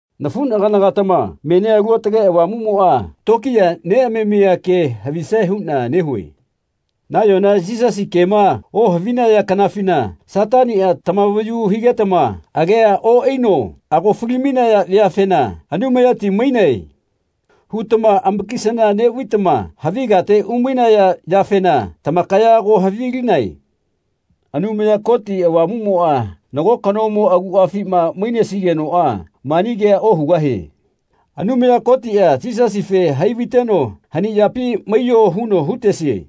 Nafuꞌnagana-gatama menia Alu Aotage Avamuꞌmoꞌa tokiya neꞌamamia ke havisae huꞌna nehue. Nayona Yisasi kema ohavinaya kanafina Sataniꞌa tamavayu higetama agea oꞌaino ago fali-mainaya veafena “Anumayati mainae.” hutama amakisana neꞌvaitama havi kate umainaya yafena tamakaya ago havilinae. Anumaya Koti Avamuꞌmoꞌa nago kanomo aguꞌafima mainesigenoꞌa mani kea ohugahie “Anumaya Kotiꞌa Yisasife hai vaiteno hani yapi maiyo huno hutesie.”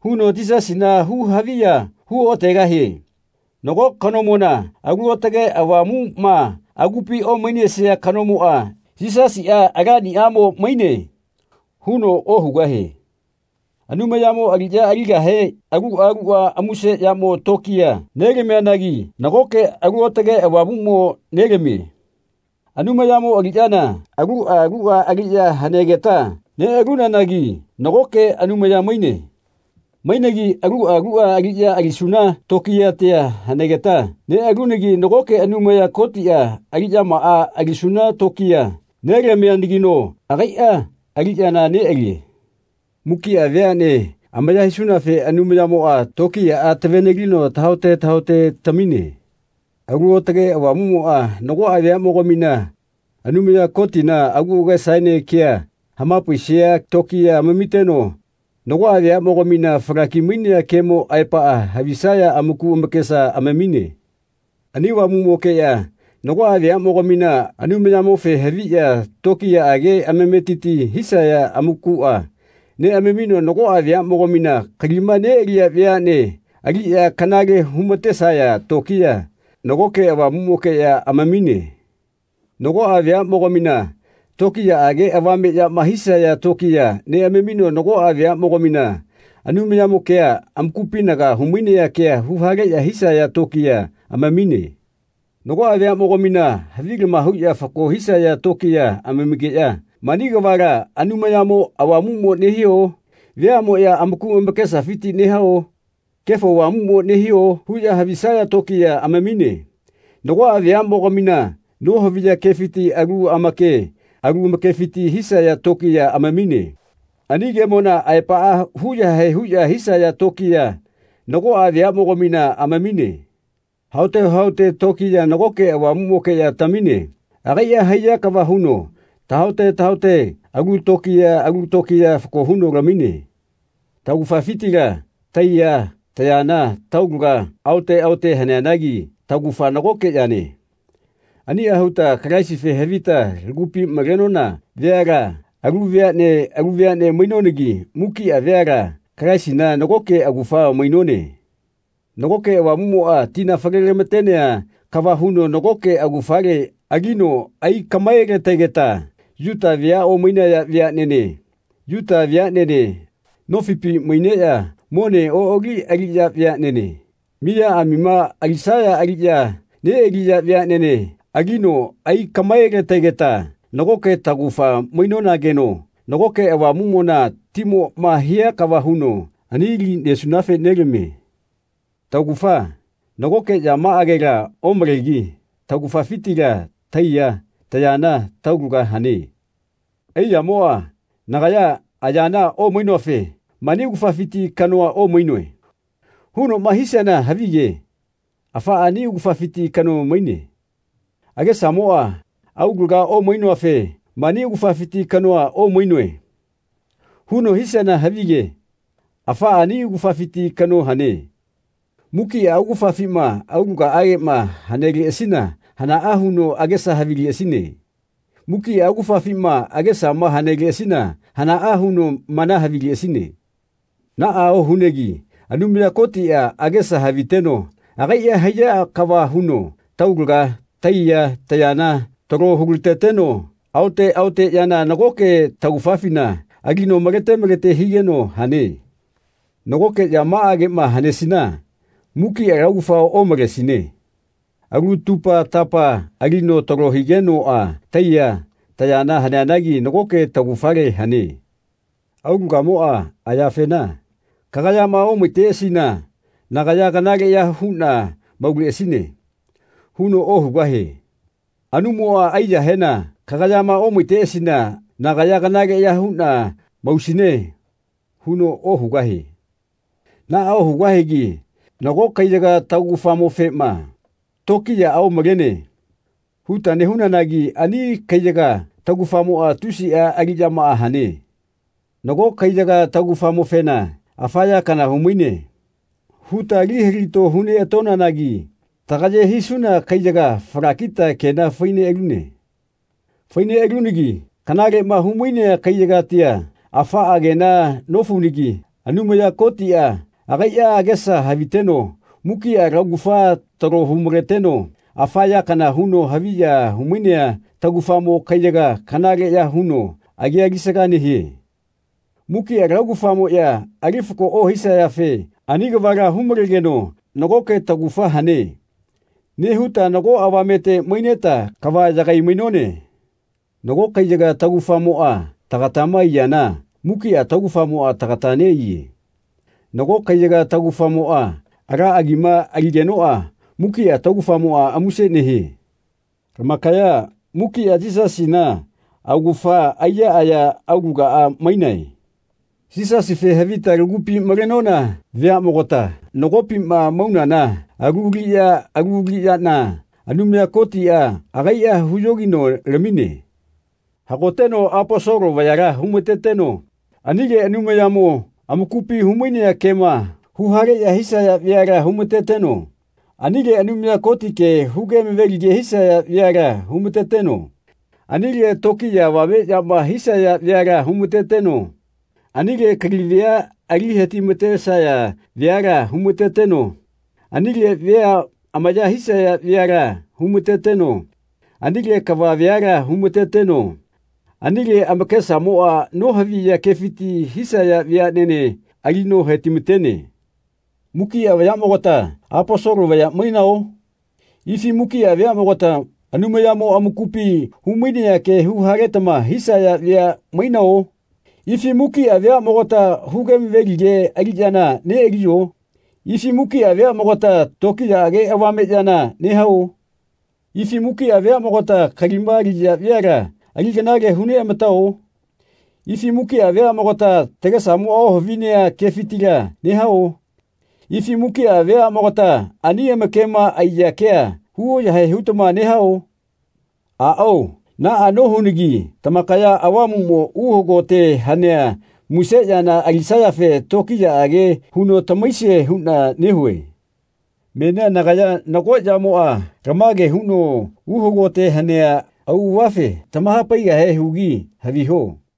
huno Yisasina hu-haviya hu oꞌategahie. Nago kanomona Alu Aotage Avamuꞌma agupi omainesia kanomoꞌa “Yisasiꞌa Alaniꞌamo maine.” huno ohugahie. Anumayamo aliꞌya aligahe aluꞌa luꞌa muse yamo tokiya nelamianagi nagoke Alu Aotage Avamuꞌmo nelamie. Anumayamo aliꞌyana aluꞌa luꞌa aliꞌya hanegeta neꞌalunanagi nagoke Anumaya maine. Mainegi aluꞌa luꞌa aliꞌya alisuna tokiyatia hanegeta neꞌalunagi nagoke Anumaya Kotiꞌa aliꞌyamaꞌa alisuna tokiya nelamianagino agaiꞌa aliꞌyana neꞌalie. Mukiꞌa veaꞌne amaya hisunafe Avamuꞌmoꞌa tokiyaꞌa tave-nelino tahaote tahaote tamine. Alu Aotage Avamuꞌmoꞌa nagoꞌa veaꞌmogamina Anumaya Kotina agu agesaene kea hamapaisia tokiya amamiteno nagoꞌa veaꞌmogamina falaki-mainea kemo aepaꞌa havisaya amaku amakesa amamine. Ani Avamuꞌmokeꞌya nagoꞌa veaꞌmogamina Anumayamofe haviꞌya tokiyaꞌage amametiti hisaya amakuꞌa neꞌamamino nagoꞌa veaꞌmogamina kalima neꞌaliya veaꞌne aliꞌya kanale humatesaya tokiya nagoke Avamuꞌmokeꞌya amamine. Nagoꞌa veaꞌmogamina tokiyaꞌage avame yama hisaya tokiya neꞌamamino nagoꞌa veaꞌmogamina Anumayamo kea amakupinaga humainea kea huhaleꞌya hisaya tokiya amamine. Nagoꞌa veaꞌmogamina havilama huꞌya fako hisaya tokiya amamigeꞌya “Mani kavala Anumayamo Avamuꞌmo nehio? Veaꞌmoꞌya amaku amakesafiti nehao? Kefo Avamuꞌmo nehio?” huꞌya havisaya tokiya amamine. Nagoꞌa veaꞌmogamina nohaviya kefiti alu amake alu amakefiti hisaya tokiya amamine. Ani kemona aepaꞌa hu yahae huꞌya hisaya tokiya nagoꞌa veaꞌmogamina amamine. Haote haote tokiya nagoke Avamuꞌmokeꞌya tamine. Agaiꞌa haiya kava huno tahaote tahaote alu lokiya alu lokiya fako huno lamine. Taugafafitila taiya, tayana, taulaga aote aote haneanagi taugafa nagoke yane. Aniꞌa huta Kalaisife havita lagupi malenona veala alu veaꞌne alu veaꞌne mainonanagi mukiꞌa veala Kalaisina nagoke augafa mainone. Nagoke Avamuꞌmoꞌa tina falelamatea kava huno nagoke augafale alino aikaꞌmaelategeta Yuta vea omainaya veaꞌnene, Yuta veaꞌnene, nofipi maineꞌya mone oꞌali aliꞌya veaꞌnene, miyaꞌamima alisaya aliꞌya neꞌaliya veaꞌnene alino aigaꞌmaelategeta nagoke taugafa mainonageno nagoke Avamuꞌmona timoꞌma hia kava huno ani li nesunafe nelamie. Taugafa nagoke yamaꞌagela omalegi taugafafitila taiya, tayana, taulaga hane. Aiyamoꞌa “Nagaya ayana omainoafe mani augafafiti kanoa omainoe.” hunoꞌma hisiana havige afaꞌa ani augafafiti kano maine. Agesamoꞌa “Aulaga omainoafe mani augafafiti kanoa omainoe.” huno hisiana havige afaꞌa ani augafafiti kano hane. Mukiꞌa augafafima aulagaꞌageꞌma haneleꞌasina hanaꞌa huno agesa havileꞌasine? Mukiꞌa augafafima agesama haneleꞌasina hanaꞌa huno mana havileꞌasine? Naꞌa ohunegi Anumaya Kotiꞌa agesa haviteno agaiꞌa haiya kava huno taulaga, taiya, tayana talo hulateteno aote aote yana nagoke taugafafina alino malete malete higeno hane. Nagoke yamaꞌageꞌma hanesina mukiꞌa laugafa omalesine. Alu tupa-tapama alino talo higenoꞌa taiya, tayana haneanagi nagoke taugafale hane. Aulagamoꞌa ayafena “Kagayama omaiteꞌasina nagaya kanaleꞌya huꞌna mauleꞌasine.” huno ohugahie. Anumoꞌa aiyahena “Kagayama omaiteꞌasina nagaya kanaleꞌya huꞌna mausine.” huno ohugahie. Naꞌa ohugahigi nago kaiyaga taugafamofema “Tokiyaꞌa omalene.” huta nehunanagi ani kaiyaga taugafamoꞌa tusiꞌa aliꞌyamaꞌa hane. Nago kaiyaga taugafamofena “Afa ya kana humaine.” huta ali hilato huneꞌatonanagi tagaye hisuna kaiyaga falakita kena fai neꞌalune. Fai neꞌalunagi kanaleꞌma humainea kaiyagatia afaꞌa kena nofaunagi Anumaya Kotiꞌa agaiꞌa agesa haviteno mukiꞌa laugafa talo humaleteno afa ya kana huno haviya humainea taugafamo kaiyaga kanaleꞌya huno agia alisaga nehie. Mukiꞌa laugafamoꞌya ali fako ohisayafe ani kavala humalegeno “Nagoke taugafa hane.” nehuta nago avamete maineta kava yagai-mainone. Nago kaiyaga taugafamoꞌa tagatama aiyana mukiꞌa laugafamoꞌa tagata neꞌaiye. Nago kaiyaga taugafamoꞌa ala agima aligenoꞌa mukiꞌa taugafamoꞌa muse nehie. Lamakaya mukiꞌa Yisasina augafa aiya, aya, aulagaꞌa mainae. Yisasife havita lagupi malenona veaꞌmogatama nagopima maunana alu aliꞌya alu aliꞌyana Anumaya Kotiꞌa agaiꞌa huyogino lamine. Hagoteno Aposolo vayala humateteno anile Anumayamo amakupi humainea kema huhaleꞌya hisaya veala humateteno anile Anumaya Koti ke huge amavelige hisaya veala humateteno anile tokiya avame yama hisaya veala humateteno anile kali vea ali hetimatesaya veala humateteno anile vea amaya hisaya veala humateteno anile kava veala humateteno anile amakesamoꞌa nohavia kefiti hisaya veaꞌnene alino hetimatene. Mukiꞌa vayaꞌmogata Aposolo vaya mainao? Ifi mukiꞌa veaꞌmogata Anumayamo amakupi humainea kea huhaletama hisaya vea mainao? Ifi mukiꞌa veaꞌmogata huge amavelige aliꞌyana neꞌaliyo? Ifi mukiꞌa veaꞌmogata tokiyaꞌage avame yana nehao? Ifi mukiꞌa veaꞌmogata kalima aliya veala ali kanale huneꞌamatao? Ifi mukiꞌa veaꞌmogata tagesamoꞌa ohavinea kefitila nehao? Ifi mukiꞌa veaꞌmogata ani amakema aiya kea hu yahae hutama nehao? Aꞌao naꞌa nohunagi tamakaya Avamuꞌmo uhagote hanea muse yana alisayafe tokiyaꞌage huno tamahaisie huꞌna nehue. Menia nagaya nago yamoꞌa lamage huno uhagote hanea auꞌavafe tamahapaigahe hugi haviho.